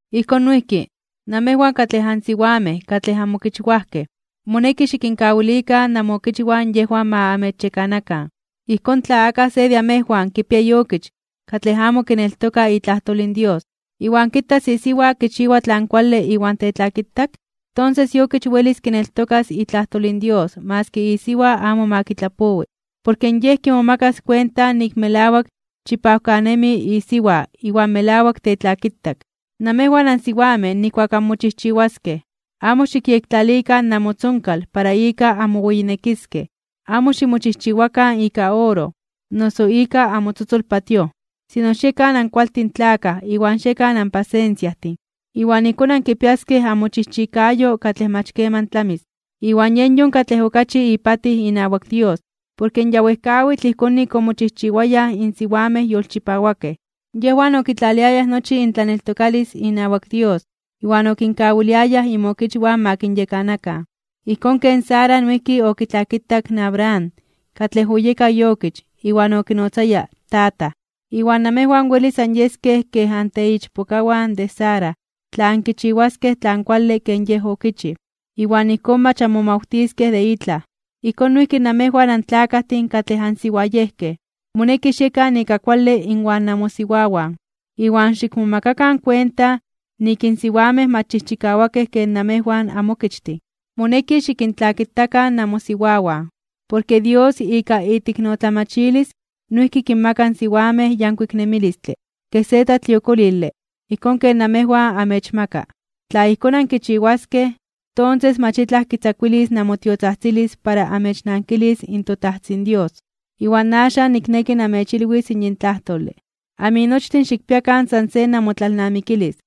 Ijkón noijki, namejwan katlej ansiwamej katlej anmokichwajkej, moneki xikinkawilikan namookichwan yejwan ma amechyekanakan. Ijkón tla akaj se de amejwan kipia iokich katlej amo kineltoka itlajtol in Dios, iwan kitas isiwa kichiwa tlan kuale iwan tetlakitak, tonses iokich welis kineltokas itlajtol in Dios maski isiwa amo ma kitlapowi. Porke yej kimomakas kuenta nik melawak chipawkanemi isiwa iwan melawak tetlakitak. Namejwan ansiwamej nijkuak anmochijchiwaskej, amo xikyektlalikan namotzonkal para ika anmoweyinekiskej, amo ximochijchiwakan ika oro, o noso ika amotzotzol patíoj. Sino xiekan ankualtin tlakaj iwan xiekan anpasensiajtin, iwan ijkón ankipiaskej amochijchikayo katlej mach keman tlamis, iwan yen yon katlej okachi ipatij inawak Dios. Porke ya wejkawitl ijkón nik omochijchiwayaj in siwamej yolchipawakej. Yejwan okitlaliayaj nochi intlaneltokalis inawak Dios iwan okinkawiliayaj inmokichwan ma kinyekanakan. Ijkón ken Sara noijki okitlakitak in Abraham katlej oyeka iokich iwan okinotzaya “tataj”. Iwan namejwan welis anyeskej kej anteichpokawan de Sara tla ankichiwaskej tlan kuale ken yej okichij, iwan ijkón mach anmomawtiskej de itlaj. Ijkón noijki namejwan tlakajtin katlej ansiwayejkej, moneki xiekan ika kuale inwan namosiwawan, iwan xikmomakakan kuenta nik in siwamej mach chijchikawakej ken namejwan anmokichtin. Moneki xikintlakitakan namosiwawan, porke Dios ika iteiknotlamachilis noijki kinmaka in siwamej yankuik nemilistle kej se tlatliokolile ijkón ken namejwan amechmaka. Tla ijkón ankichiwaskej, tonses mach itlaj kitzakuilis namotiotzajtzilis para amechnankilis in toTajtzin Dios. Iwan axan nikneki namechilwis yin tlajtole. Aminochtin xikpiakan san se namotlalnamikilis.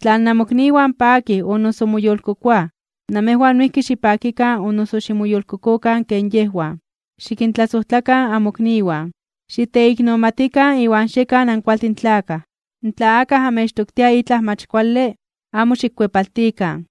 Tla namokniwan pakij o noso moyolkokoaj, namejwan noijki xipakikan o noso ximoyolkokokan ken yejwan. Xikintlasojtlakan amokniwan, xiteiknomatikan iwan xiekan ankualtin tlakaj. Tla akaj amechtoktia itlaj mach kuale, amo xikkuepaltikan.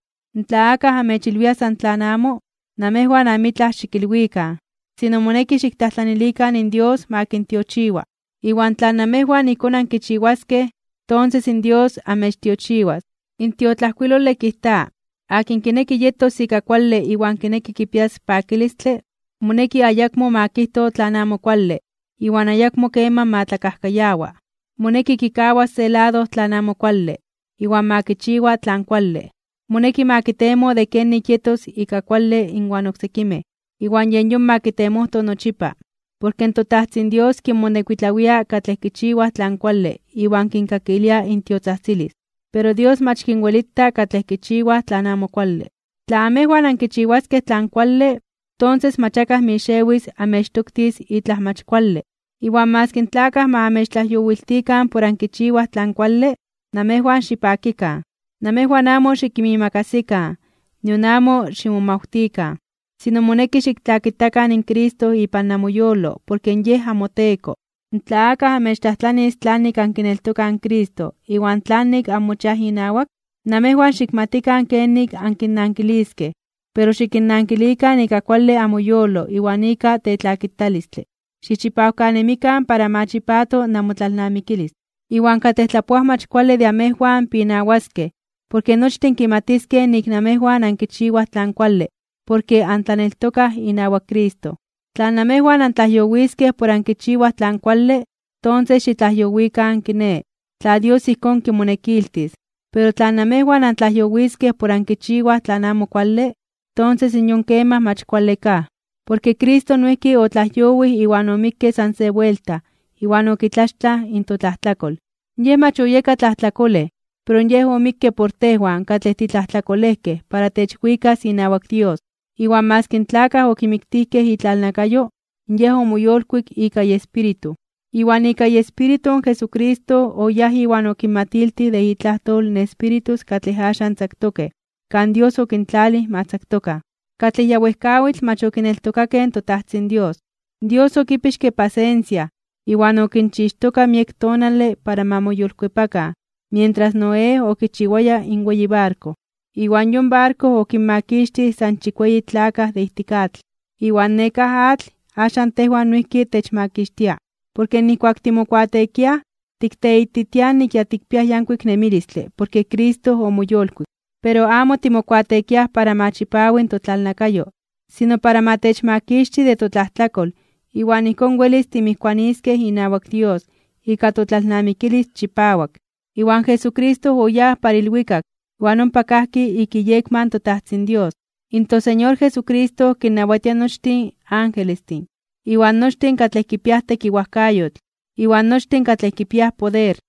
Tla akaj amechilwia san tlan amo, namejwan amitlaj xikilwikan. Sino moneki xiktlajtlanilikan in Dios ma kintiochiwa, iwan tla amejwan ijkón ankichiwaskej, tonses in Dios amechtiochiwas. In tiotlajkuilole kijta: Akin kineki yetos ika kuale iwan kineki kipias pakilistle, moneki ayakmo ma kijto tlan amo kuale iwan ayakmo keman ma tlakajkayawa. Moneki kikawas se lado tlan amo kuale, iwan ma kichiwa tlan kuale. Moneki ma kitemo de kenik yetos ika kuale inwan oksekimej, iwan yen yon ma kitemojto nochipa. Porke toTajtzin Dios kinmonekuitlawia katlej kichiwaj tlan kuale iwan kinkakilia intiotzajtzilis. Pero Dios mach kinwelita katlej kichiwaj tlan amo kuale. Tla amejwan ankichiwaskej tlan kuale, tonses mach akaj mixewis amechtoktis itlaj mach kuale. Iwan maski in tlakaj ma amechtlajyowiltikan por ankichiwaj tlan kuale, namejwan xipakikan. Namejwan amo xikinmiimakasikan iwan nion amo ximomawtikan. Sino moneki xiktlakitakan in Cristo ipan namoyolo porke yen namoTeko. Tla akaj amechtlajtlanis tlanik ankineltokaj in Cristo iwan tlanik anmochiaj inawak, namejwan xikmatikan kenik ankinnankiliskej, pero xikinnankilikan ika kuale amoyolo iwan ika tetlakitalistle. Xichipawkanemikan para ma chipato namotlalnamikilis. Iwan katlej tlapoaj mach kuale de amejwan pinawaskej porke nochtin kimatiskej nik namejwan ankichiwaj tlan kuale porke antlaneltokaj inawak Cristo. Tla namejwan antlajyowiskej por ankichiwaj tlan kuale, tonses xitlajyowikan kiné, tla Dios ijkón kimonekiltis. Pero tla namejwan antlajyowiskej por ankichiwaj tlan amo kuale, tonses yon kemaj mach kuale kaj. Porke Cristo noijki otlajyowij iwan omikke san se buelta iwan okitlaxtlaj in totlajtlakol. Yej mach oyeka tlajtlakolej pero Yej omikke por tejwan katlej titlajtlakolejkej para techwikas inawak Dios. Iwan maski in tlakaj okimiktijkej itlalnakayo, Yej omoyolkuik ika iEspíritu. Iwan ika iEspíritu in Jesucristo oyáj iwan okinmatiltij de itlajtol in espíritus katlej axan tzaktokej kan Dios okintlalij ma tzaktokan, katlej ya wejkawitl mach okineltokakej in toTajtzin Dios. Dios okipixke pasensia iwan okinchixtoka miek tonale para ma moyolkuepakan mientras Noé okichiwaya in weyi barko. Iwan yon barko okinmakixtij san chikueyi tlakaj de ijtik atl. Iwan nekáj atl axan tejwan noijki techmakixtia, porke nijkuak timokuateekiaj tikteititiaj nik ya tikpiaj yankuik nemilistle porke Cristo omoyolkuik. Pero amo timokuateekiaj para ma chipawi totlalnakayo, sino para ma techmakixti de totlajtlakol iwan ijkón welis timijkuaniskej inawak Dios ika totlalnamikilis chipawak. Iwan Jesucristo oyáj para ilwikak iwan ompa kajki ik iyekma in toTajtzin Dios. In toSeñor Jesucristo kinnawatia nochtin angelestin, iwan nochtin katlej kipiaj tekiwajkayotl, iwan nochtin katlej kipiaj poder.